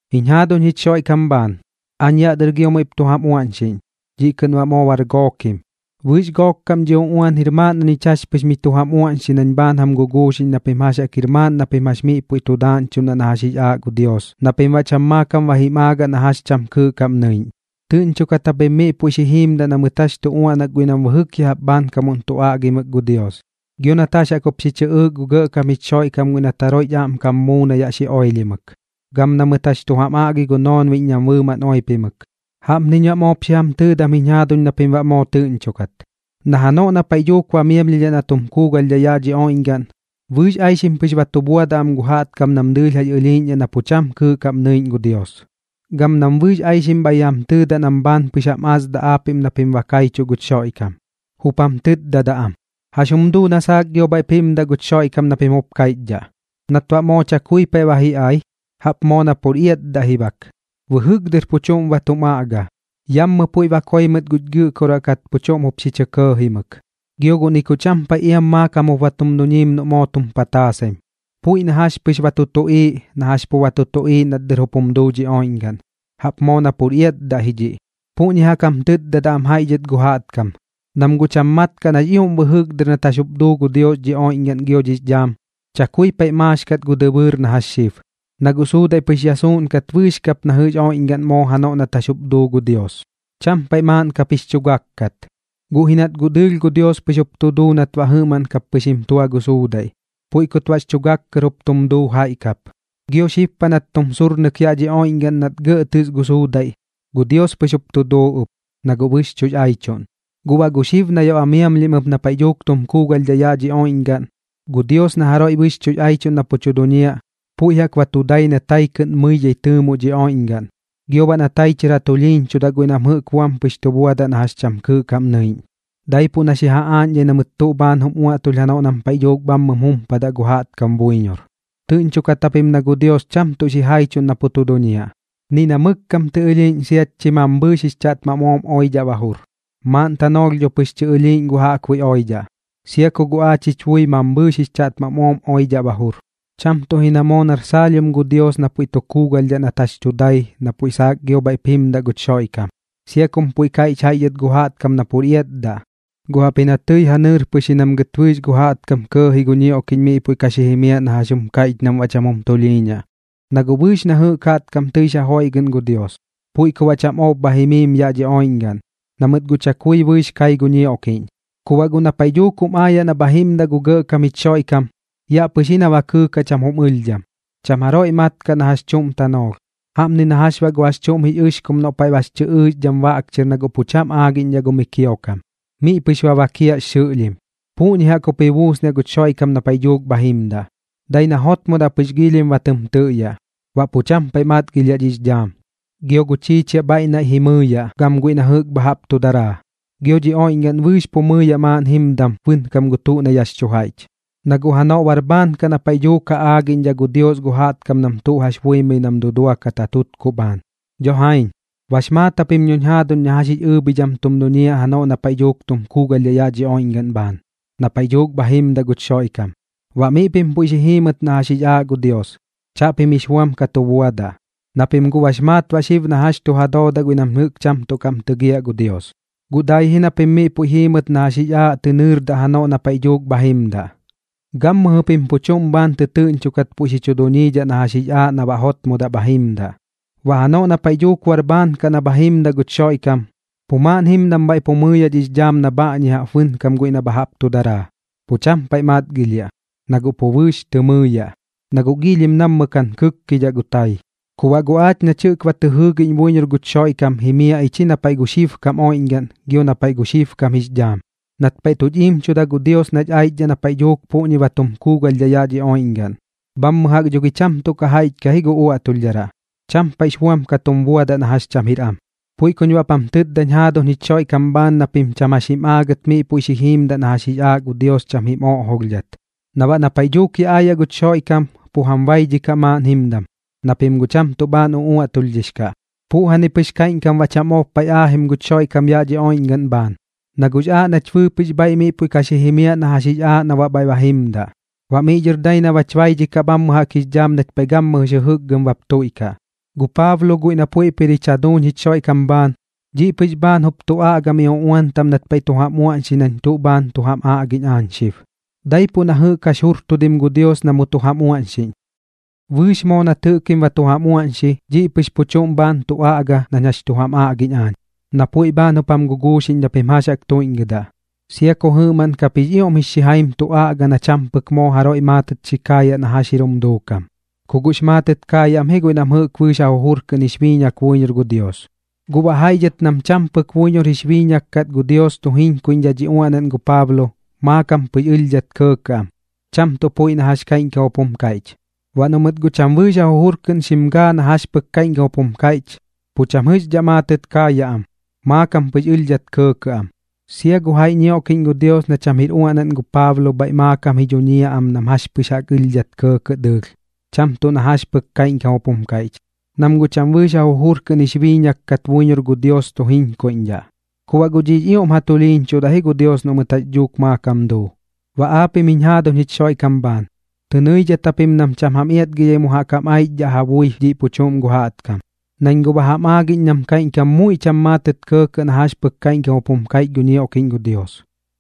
Jiñ jaaduñ jich Xoiꞌkam bhaan, aañ yaꞌ dɨr gio muiꞌp tu jam uaꞌñxiꞌñ, dhiꞌ kɨꞌn baꞌ moo bar gookim. Bɨɨx gook kaꞌm dhiꞌ uꞌuan jir maaꞌn na ñich jax pɨx miꞌ tu jam uaꞌñxi nañ bhaan jam guguuxiꞌñ na pim jax jaꞌk jir maaꞌn na pim jax miꞌ puiꞌ tu daaꞌñchuꞌn na jax jix aaꞌ gu Dios na pim baꞌ cham maakam ba jim aagaꞌ na jax cham kɨɨꞌ kaꞌm nɨiꞌñ. Tɨꞌñchokat japim miꞌ puiꞌ xi jiimdaꞌ na mɨt jax tu uaꞌnak guiꞌ nam bɨjɨk ya jaꞌp bhaankamuꞌn tu aꞌgimɨk gu Dios, gio nat jax jaꞌk jup xi chɨꞌɨɨk gu Gɇꞌkam jich Xoiꞌkam guiꞌ nat jaroiꞌch aꞌmkam muu na yaꞌ xi oilhimɨk, gam na mɨt jax tu jam aꞌgi gu noonbiꞌñ nam bɨɨmaꞌn oipimɨk. Jaꞌpniñ baꞌ moop xi jam tɨɨdam jiñ jaaduñ na pim baꞌ moo tɨꞌñchokat, na janoꞌ na paiꞌ dhuuk ba miamlhidhaꞌ na tum kuugalhdhaꞌ yaꞌ dhi oiꞌñgaꞌn, bɨɨx aixim pɨx ba tu buadaꞌ am gu jaꞌtkam nam dɨɨlh jax ɨlhiiꞌñdhaꞌ na pu cham kɨɨꞌ kaꞌm nɨiꞌñ gu Dios, gam nam bɨɨx aixim bhaiꞌ ji jam tɨɨdaꞌ nam bhaan pɨx jam asdaꞌ aapiꞌm na pim ba kaichuꞌ guch Xoiꞌkam. Jup jam tɨtdadaꞌ am: “¿Jax jum duu na saak gio bhaiꞌp jimdaꞌ guch Xoiꞌkam na pim jup kaiꞌchdhaꞌ, nat baꞌ moo cham paiꞌ ba ji ai? Jaꞌp moo na pur iatdaꞌ ji bak. Bɨjɨk dɨr pu chuꞌm ba tum aꞌga, yammɨ puiꞌ ba koi mɨt guch gɨꞌkoraꞌ kat pu chuꞌm jup xi chɇ kɇɇjimɨk. Gio guꞌ ni ku cham paiꞌ iam maakam jup ba tum duñiim noꞌ moo tum pataasaim, puiꞌ na jax pɨx ba tu tuꞌiiꞌ na jax pu ba tu tuꞌiiꞌ nat dɨr jup jum duu dhi oiꞌñgaꞌn. Jaꞌp moo na pur iatdaꞌ ji dhiꞌ.” Puꞌñi jaꞌk jam tɨtdadaꞌ am jaiꞌ dhɨt gu jaꞌtkam, nam guꞌ cham mat kaꞌ nax ioꞌm bɨjɨk dɨr nat jax jup duu gu Dios dhi oiꞌñgaꞌn gio dhix dhaam, chakui paiꞌx maax kat gu dɨbɨɨr na jax xib. Na guꞌ suudaiꞌ pɨx ya suuꞌn kat bɨɨx kap na jɨꞌx oiꞌñgaꞌn moo janoꞌ nat jax jup duu gu Dios, cham paiꞌ maaꞌn kap jix chu gak kat. Guꞌ ji nat guꞌ dɨɨlh gu Dios pɨx jup tu duu nat baꞌ jɨꞌmaꞌn kap pɨx jim tua gu suudaiꞌ, puiꞌ kut baꞌx chu gak kɨr jup tum duu jaiꞌ kap. Gio xib paꞌ nat tum surnɨk yaꞌ dhi oiꞌñgaꞌn nat gɇꞌ tɨs gu suudaiꞌ, gu Dios pɨx jup tu duu ɨp, na guꞌ bɨxchuꞌx aichuꞌn. Guꞌ baꞌ gu xib na yaꞌ ba miamlhim ɨp na paiꞌ dhuuk tum kuugalhdhaꞌ yaꞌ dhi oiꞌñgaꞌn, gu Dios na jaroiꞌ bɨxchuꞌx aichuꞌn na pu tu duñiaꞌ, puiꞌ jaꞌk ba tu dai na tai kɨꞌn mɨidhai tɨɨmoꞌ dhi oiꞌñgaꞌn. Gio baꞌ na tai chɨr ja tulhiiñchudaꞌ guiꞌ nam jɨꞌk buam pɨx tu buadaꞌ na jax cham kɨɨꞌ kaꞌm nɨiꞌñ, daipuꞌ na xi ja aaꞌñdhai na mɨt tuꞌ bhaan jum uaꞌtulh janoꞌ nam paiꞌ dhuuk bhammɨm jumpadaꞌ gu jaꞌtkam buiñor. Tɨꞌñchokat japim na gu Dios cham tuꞌ xijaichuꞌn na pu tu duñiaꞌ, ni na mɨk kam tɨ ɨlhiiꞌñ siat chi mambhɨɨx jix chaꞌtmam ooꞌm oidhaꞌ ba jur. Maaꞌn tanoolh dho pɨx tɨ ɨlhiiꞌñ gu jaꞌkbuiꞌ oidhaꞌ, sia ku guꞌ aach jich bui mambhɨɨx jix chaꞌtmam ooꞌm oidhaꞌ ba jur. Cham tuꞌ ji na moo nar saalhiom gu Dios na puiꞌ tu kuugalhdhaꞌ nat jax tu dai na puiꞌ saak gio bhaiꞌp jimdaꞌ guch Xoiꞌkam, sia kum puiꞌ kaiꞌch jaiꞌ dhɨt gu jaꞌtkam na pur iatdaꞌ. Guꞌ jaꞌpji na tɨi ja nɨɨr pɨx ji nam gɨt bɨɨx gu jaꞌtkam kɇɇji gu ñioꞌkiꞌñ miꞌ puiꞌ ka xi jimiaꞌ na jax jum kaiꞌch nam baꞌ cham jum tulhiiñaꞌ. Na guꞌ bɨɨx na jɨꞌk jaꞌtkam tɨix ja joiꞌgɨꞌn gu Dios, puiꞌ ku baꞌ cham ob bha jimiim yaꞌ dhi oiꞌñgaꞌn, na mɨt guꞌ chakui bɨɨx kai gu ñioꞌkiꞌñ. Ku baꞌ guꞌ na paiꞌ dhuuk jum aayaꞌ na bha jimdaꞌ gu Gɇꞌkam jich Xoiꞌkam, yaꞌ pɨx ji na ba kɨɨkaꞌ cham jum ɨlhdham, cham jaroiꞌ mat kaꞌ na jax chuꞌm tanoolh. Jaꞌpni na jax baꞌ gu jax chuꞌm jix ɨxkum noꞌ paiꞌ bax chɨ ɨɨxdham baꞌk chɨr na guꞌ pu cham aagiꞌñdhaꞌ gu mi kiokam, miꞌ pɨx ba bakiaꞌx xɨꞌlhim. Puꞌñi jaꞌk jup ji buusniaꞌ guch Xoiꞌkam na paiꞌ dhuuk bha jimdaꞌ, dai na jotmodaꞌ pɨx giilhim ba tɨm tɨꞌyaꞌ. Baꞌ pu cham paiꞌ matgilhiaꞌ dhix dhaam, gio gu chiichiaꞌ bhaiꞌ naiꞌ ji mɨɨyaꞌ gam guiꞌ na jɨꞌk tuꞌ bha jaꞌp tu daraa. Gio dhi oiꞌñgaꞌn bɨɨx pu mɨɨyaꞌ maaꞌn jimdam bɨnkam gu tuꞌ na yaꞌx chu jaiꞌch, na guꞌ janoꞌ bar bhaan kaꞌ na paiꞌ dhuuk ja aagiꞌñdhaꞌ gu Dios gu jaꞌtkam nam tuꞌ jax buimɨi nam duduakat ja tutkuꞌ bhaan. Dho jaiñ, bax maat japim dhoñ jaaduñ na jax jix ɨɨbhidham tum duñiaꞌ janoꞌ na paiꞌ dhuuk tum kuugalhdhaꞌ yaꞌ dhi oiꞌñgaꞌn bhaan, na paiꞌ dhuuk bha jimdaꞌ guch Xoiꞌkam. Baꞌ miꞌ pim puiꞌ xi jiimɨt na jax jix aaꞌ gu Dios, chaꞌpim jix buam ka tu buadaꞌ, na pim guꞌ bax maat baꞌ xib na jax chu ja doodaꞌ guiꞌ nam jɨꞌk cham tuꞌ kaꞌm tɨgiaꞌ gu Dios. Guꞌ dai ji na pim miꞌ puiꞌ jiimɨt na jax jix aaꞌ pɨx tɨ nɨɨrdaꞌ janoꞌ na paiꞌ dhuuk bha jimdaꞌ. Gammɨjɨ pim pu chuꞌm bhaan tɨtɨɨꞌñchokat puiꞌ xi chu duñiidhaꞌ na jax jix aaꞌ na baꞌ jotmodaꞌ bha jimdaꞌ. Baꞌ janoꞌ na paiꞌ dhuuk bar bhaan kaꞌ na bha jimdaꞌ guch Xoiꞌkam, pu maaꞌn jimdam bhaiꞌ pu mɨɨyaꞌ dhix dhaam na bhaꞌñi jaꞌp bɨnkam guiꞌ na jɨꞌk bha jaꞌp tuꞌ daraa. Pu cham paiꞌ tu matgilhiaꞌ, na guꞌ pu bɨɨx tɨ mɨɨyaꞌ, na guꞌ giilhim nammɨ kaꞌn kɨkkidhaꞌ gu tai. Ku baꞌ guꞌ aach nach jɨꞌk ba tɨ jɨɨgiꞌñ buiñor guch Xoiꞌkam jimiaꞌ ich ji na paiꞌ gu xibkam oiꞌñgaꞌn gio na paiꞌ gu xibkam jix dhaam, nat paiꞌ tuch iimchuda gu Dios nach aichdhaꞌ na paiꞌ dhuuk puꞌñi ba tum kuugalhdhaꞌ yaꞌ dhi oiꞌñgaꞌn. Bhammɨ jaꞌk dho gi cham tuꞌ ka jaiꞌch kaꞌ ji gu uaꞌtulhdharaꞌ, cham paiꞌx buam ka tum buadaꞌ na jax cham jir am. Puiꞌ kuñ baꞌp jam tɨtdañ jaaduñ jich Xoiꞌkam bhaan na pim cham jax jim aagit miꞌ puiꞌ xi jiimdaꞌ na jax jix aaꞌ gu Dios cham jim oꞌjolhdhat, na baꞌ na paiꞌ dhuuk yaꞌ aayaꞌ guch Xoiꞌkam, pu jam baidhikaꞌ maaꞌn jimdam, na pim guꞌ cham tuꞌ bhaan uꞌuaꞌtulhdhix kaꞌ. Puꞌjani pɨx kaiꞌñkam baꞌ cham ob paiꞌ aajim guch Xoiꞌkam yaꞌ dhi oiꞌñgaꞌn bhaan, na guꞌx aaꞌ nach bɨɨpɨꞌx bhaiꞌ miꞌ puiꞌ ka xi jimiaꞌ na jax jix aaꞌ na baꞌ bhaiꞌ ba jimdaꞌ, baꞌ miꞌ dhɨr dai na bach baidhikaꞌx dhaam nach paiꞌ gammɨjɨx jɨjɨkgɨm bap tuiꞌkaꞌ. Gu Paablo guiꞌ na puiꞌp jir jich jaduuñ jich Xoiꞌkam bhaan, dhiꞌ pɨx bhaan jup tu aꞌga miꞌ uꞌuan taꞌm nat paiꞌ tu jam uaꞌñxi nañ tuꞌ bhaan tu jam aꞌgiꞌñ aañ xib, daipuꞌ na jɨꞌk jax jurtudim gu Dios na mu tu jam uaꞌñxiꞌñ. Bɨɨx moo nat jɨꞌkim ba tu jam uaꞌñxi, dhiꞌ pɨx pu chuꞌm bhaan tu aꞌga nañ jax chu jam aꞌgiꞌñ aañ, na puiꞌ bhaan jup jam guguuxiꞌñ na pim jax jaꞌk tuiꞌñgɨdaꞌ, sia ku jɨꞌmaꞌn kap jix ioꞌm jix xijaim tu aꞌga na cham pɨk moo jaroiꞌ maatɨt xi kaayaꞌ na jax jir jum duukam. Ku guꞌx maatɨt kaayaꞌ am ji guiꞌ nam bɨɨx ja jujur kɨꞌn jix biiñak buiñor gu Dios. Guꞌ baꞌ jaiꞌ dhɨt nam cham pɨk buiñor jix biiñak kat gu Dios tu jiñkuiꞌñdhaꞌ dhi uaꞌnaꞌn gu Paablo, maakam pɨx ɨlhdhat kɇɇkɇꞌ am, cham tuꞌ puiꞌ na jax kaiꞌñkam jup jum kaiꞌch. Baꞌ noꞌ mɨt guꞌ cham bɨɨx ja jujur kɨꞌn xim gaa na jax pɨk kaiꞌñkam jup jum kaiꞌch, pu cham jɨꞌxdhaꞌ maatɨt kaayaꞌ am, maakam pɨx ɨlhdhat kɇɇkɇꞌ am. Sia gu jaiꞌ ñioꞌkiꞌñ gu Dios na cham jir uaꞌnaꞌn gu Paablo bhaiꞌ maakam ji dhuñiaꞌ am nam jax pɨx jaꞌk ɨlhdhat kɇɇkɇꞌ dɨɨlh, cham tuꞌ na jax pɨk kaiꞌñkam jup jum kaiꞌch, nam guꞌ cham bɨɨx ja jujur kɨꞌn jix biiñak kat buiñor gu Dios tu jiñkuidhaꞌ. Ku baꞌ guꞌ dhiꞌx ioꞌm ja tulhiiñchudaꞌ ji gu Dios noꞌ mɨt jax dhuuk maakam duu. Baꞌ aapiꞌm jiñ jaaduñ jich Xoiꞌkam bhaan, tɨ nɨidhat japim nam cham jam iatgidhai mu jaꞌk jam aichdhaꞌ ja bui dhiꞌ pu chuꞌm gu jaꞌtkam, nañ guꞌ ba jam aagiꞌñ nam kaiꞌñkam muiꞌ cham maatɨt kɇɇkɇꞌ na jax pɨk kaiꞌñkam jup jum kaiꞌch gu ñioꞌkiꞌñ gu Dios.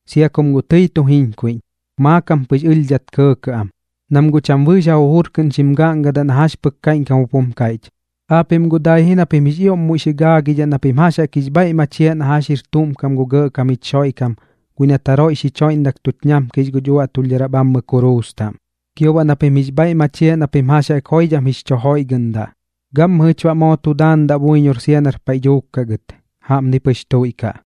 Sia kum guꞌ tɨi tu jiñkuiꞌñ, maakam pɨx ɨlhdhat kɇɇkɇꞌ am, nam guꞌ cham bɨɨx ja jujur kɨꞌn xim gaꞌngadaꞌ na jax pɨk kaiꞌñkam jup jum kaiꞌch. Aapiꞌm guꞌ dai ji na pim jix ioꞌm muiꞌ xi gaagidhaꞌ na pim jax jaꞌk jix bhaiꞌ machiaꞌ na jax jir tuꞌm kam gu Gɇꞌkam jich Xoiꞌkam guiꞌ nat jaroiꞌ xich joiꞌndak tuch ñamkix guch uaꞌtulhdharaꞌ bhammɨ kuruus taꞌm, gio baꞌ na pim jix bhaiꞌ machiaꞌ na pim jax jaꞌk joidham jix chu joiꞌgɨꞌndaꞌ. Gammɨjɨch baꞌ moo tu daandaꞌ buiñor sia nar paiꞌ dhuuk kaꞌ gɨt. Jaꞌpni pɨx tuiꞌkaꞌ.